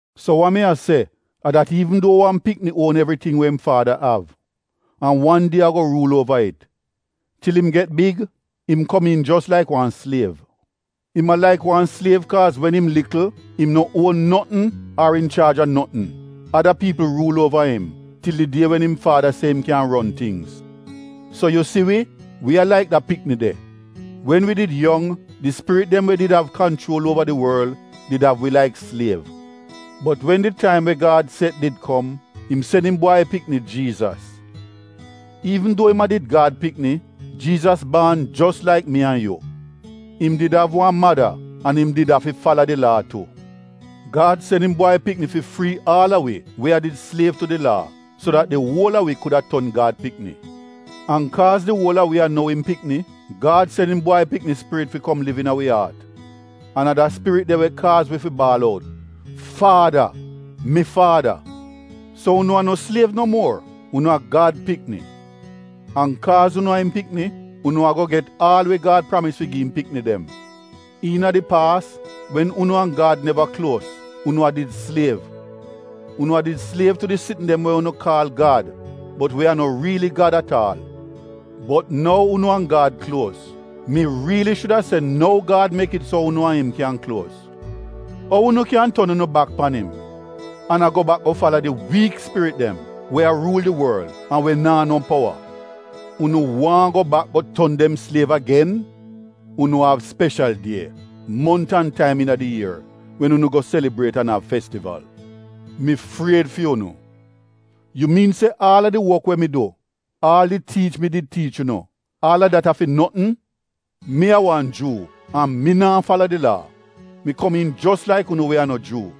So wa mi a se a dat iivn duo wan pikni uon evriting we im faada av an wan die ago ruul uova it — til im get big, im komiin jos laik wan sliev. Im a laik wan sliev kaaz wen im likl im no uon notn ar inchaaj a notn. Ada piipl ruul uova im til di die wen im faada se im kyan ron tingz. So yu si wi, wi a laik da pikni de. Wen wi did yong, di spirit dem we did av kanchuol uova di worl did av wi laik sliev. Bot wen di taim we Gad set did kom, im sen im Bwai Pikni, Jiizas. Iivn duo im a did Gad pikni, Jiizas baan jos laik mi an yu. Im did av wan mada an im did afi fala di Laa tu. Gad sen im Bwai Pikni fi frii aal a wi we a did sliev tu di Laa so dat di uol a wi kuda ton Gad pikni. An kaaz di uol a wi a nou im pikni, Gad sen im Bwai Pikni Spirit fi kom liv iina wi aat. An a da Spirit de we kaaz wi fi baal out, “Faada, mi Faada.” So unu a no sliev no muor; unu a Gad pikni. An kaaz unu a im pikni, unu ago get aal we Gad pramis fi gi im pikni dem. Iina di paas, wen unu an Gad neva kluos, unu a did sliev. Unu a did sliev tu di sitn dem we unu kaal gad bot we a no riili gad at aal. Bot nou unu an Gad kluos — mi riili shuda se nou Gad mek it so unu an im kyan kluos — ou unu kyan ton unu bak pan im an a go bak go fala di wiik spirit dem we a ruul di worl an we naa no powa? Unu waahn go bak go ton dem sliev agen? Unu av speshal die, mont an taim iina di ier wen unu go selibriet an av festival. Mi fried fi unu. Yu miin se aal a di wok we mi du — aal di tiich mi did tiich unu — aal a dat a fi notn? Mi a wan Juu an mi naa fala di Laa — mi komiin jos laik unu we a no Juu.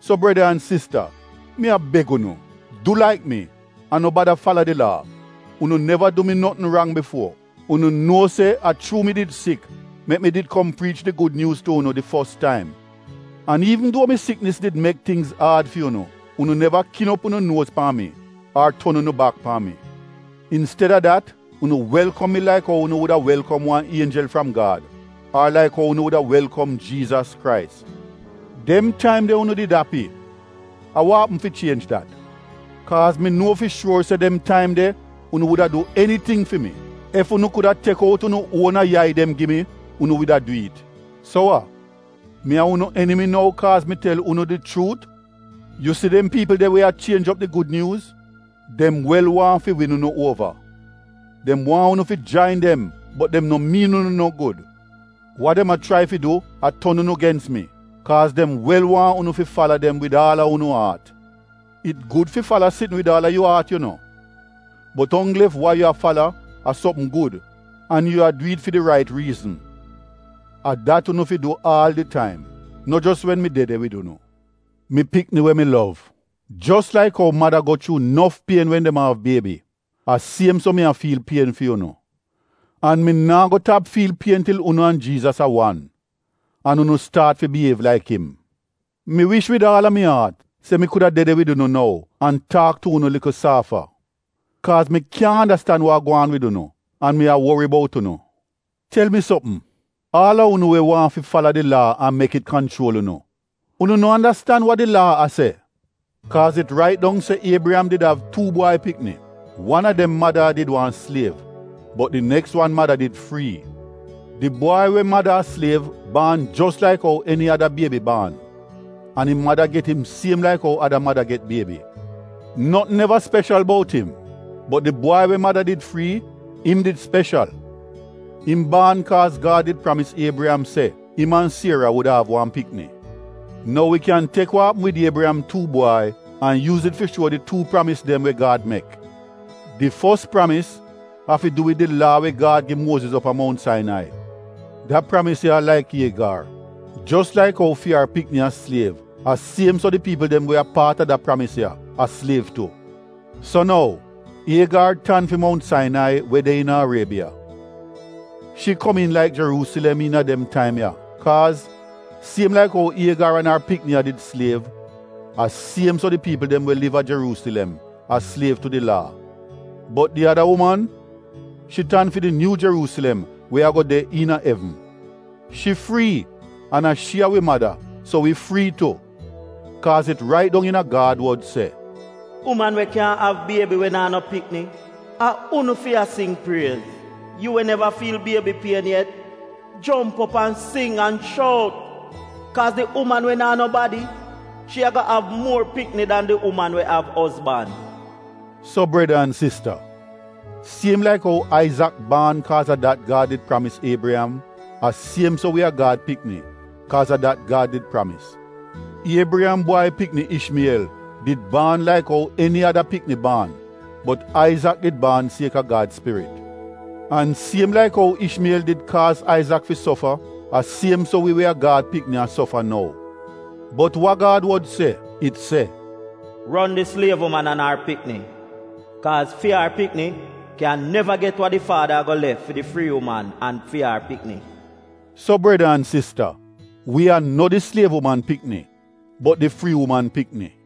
So breda an sista mi a beg unu, du laik mi an no bada fala di Laa. Unu neva du mi notn rang bifuo. Unu nuo se a chuu mi did sik mek mi did kom priich di Gud Nyuuz tu unu di fos taim. An iivn duo mi siknis did mek tingz aad fi unu, unu neva kin op unu nuoz pan mi ar ton unu bak pan mi. Insteda dat unu welkom mi laik ou unu wuda welkom wan ienjel fram Gad ar laik ou unu wuda welkom Jiizas Krais. Dem taim de unu did api, a wa apm fi chienj dat? Kaaz mi nuo fi shuor se dem taim de unu wuda du eniting fi mi. Ef unu kuda tek ou unu uona yai dem gi mi, unu wuda du it. So wa, mi a unu enimi nou kaaz mi tel unu di chuut? Yu si dem piipl de we a chienj op di Gud Nyuuz, dem wel waahn fi win unu uova. Dem waahn unu fi jain dem bot dem no miin unu no gud. Wa dem a chrai fi du a ton unu gens mi, kaaz dem wel waahn unu fi fala dem wid aal a unu aat. It gud fi fala sitn wid aal a yu aat yu no, bot onggl ef wa yu a fala a sopm gud an yu a du it fi rait riizn. A dat unu fi du aal di taim, no jos wen mi de de wid unu. Mi pikni we mi lov, jos laik ou mada go chuu nof pien wen dem a av biebi — a siem so mi a fiil pien fi unu. An mi naa go tap fiil pien til unu an Jiizas a wan, an unu staat fi biyiev laik im. Mi wish wid aal a mi aat se mi kuda de de wid unu nou an taak tu unu likl saafa. Kaaz mi kyaahn andastan wa a gwaan wid unu an mi a wori bout unu. Tel mi sopm, aal a unu we waahn fi fala di Laa an mek it kanchuol unu, unu no andastan wa di Laa a se? Kaaz it rait dong se Iebriyam did av tuu bwai pikni. Wan a dem mada a did wan sliev bot di neks wan mada did frii. Di bwai we mada a sliev baan jos laik ou eni ada biebi baan an im mada get im siem laik ou ada mada get biebi. Notn neva speshal bout im. Bot di bwai we mada did frii im did speshal. Im baan kaaz Gad did pramis Iebriyam se im an Siera wuda av wan pikni. Nou wi kyan tek wa apm wid Iebriyam tuu bwai an yuuz it fi shuo di tuu pramis dem we Gad mek. Di fos pramis afi du wid di Laa we Gad gi Muoziz op a Mount Sainai. Da pramis ya a laik Iegar. Jos laik ou fi ar pikni a sliev a siem so di piipl dem we a paat a da pramis ya, a sliev tu. So nou Iegar tan fi Mount Sainai we de iina Ariebiya. Shi komiin laik Jeruusilem iina dem taim ya, kaaz, siem laik ou Iegar an ar pikni a did sliev, a siem so di piipl dem we liv a Jeruusilem a sliev tu di Laa. Bot di ada uman, shi tan fi di nyuu Jeruusilem we ago de iina evn. Shi frii, an a shi a wi mada so wi frii tu. Kaaz it rait dong iina Gad wod se: “Uman we kyaahn av biebi we naa no pikni — a unu fi a sing priez; Yu we neva fiil biebi pien yet — jomp op an sing an shout; kaaz di uman we naa nobadi — shi ago av muor pikni dan di uman we av ozban.” So Breda an sista, siem laik ou Aizak baan kaaz a dat Gad did pramis Iebriyam, a siem so wi a Gad pikni kaaz a dat Gad did pramis. Iebriyam bwai pikni Ishmiyel did baan laik ou eni ada pikni baan bot Aizak did baan sieka Gad Spirit. An siem laik ou Ishmiyel did kaaz Aizak fi sofa a siem so wi we a Gad pikni a sofa nou. Bot wa Gad wod se? It se, “Ron di sliev uman an ar pikni, kaaz fi ar pikni kyan neva get wa di faada ago lef fi di frii uman an fi ar pikni.” So breda an sista, wi a no di sliev uman pikni bot di frii uman pikni.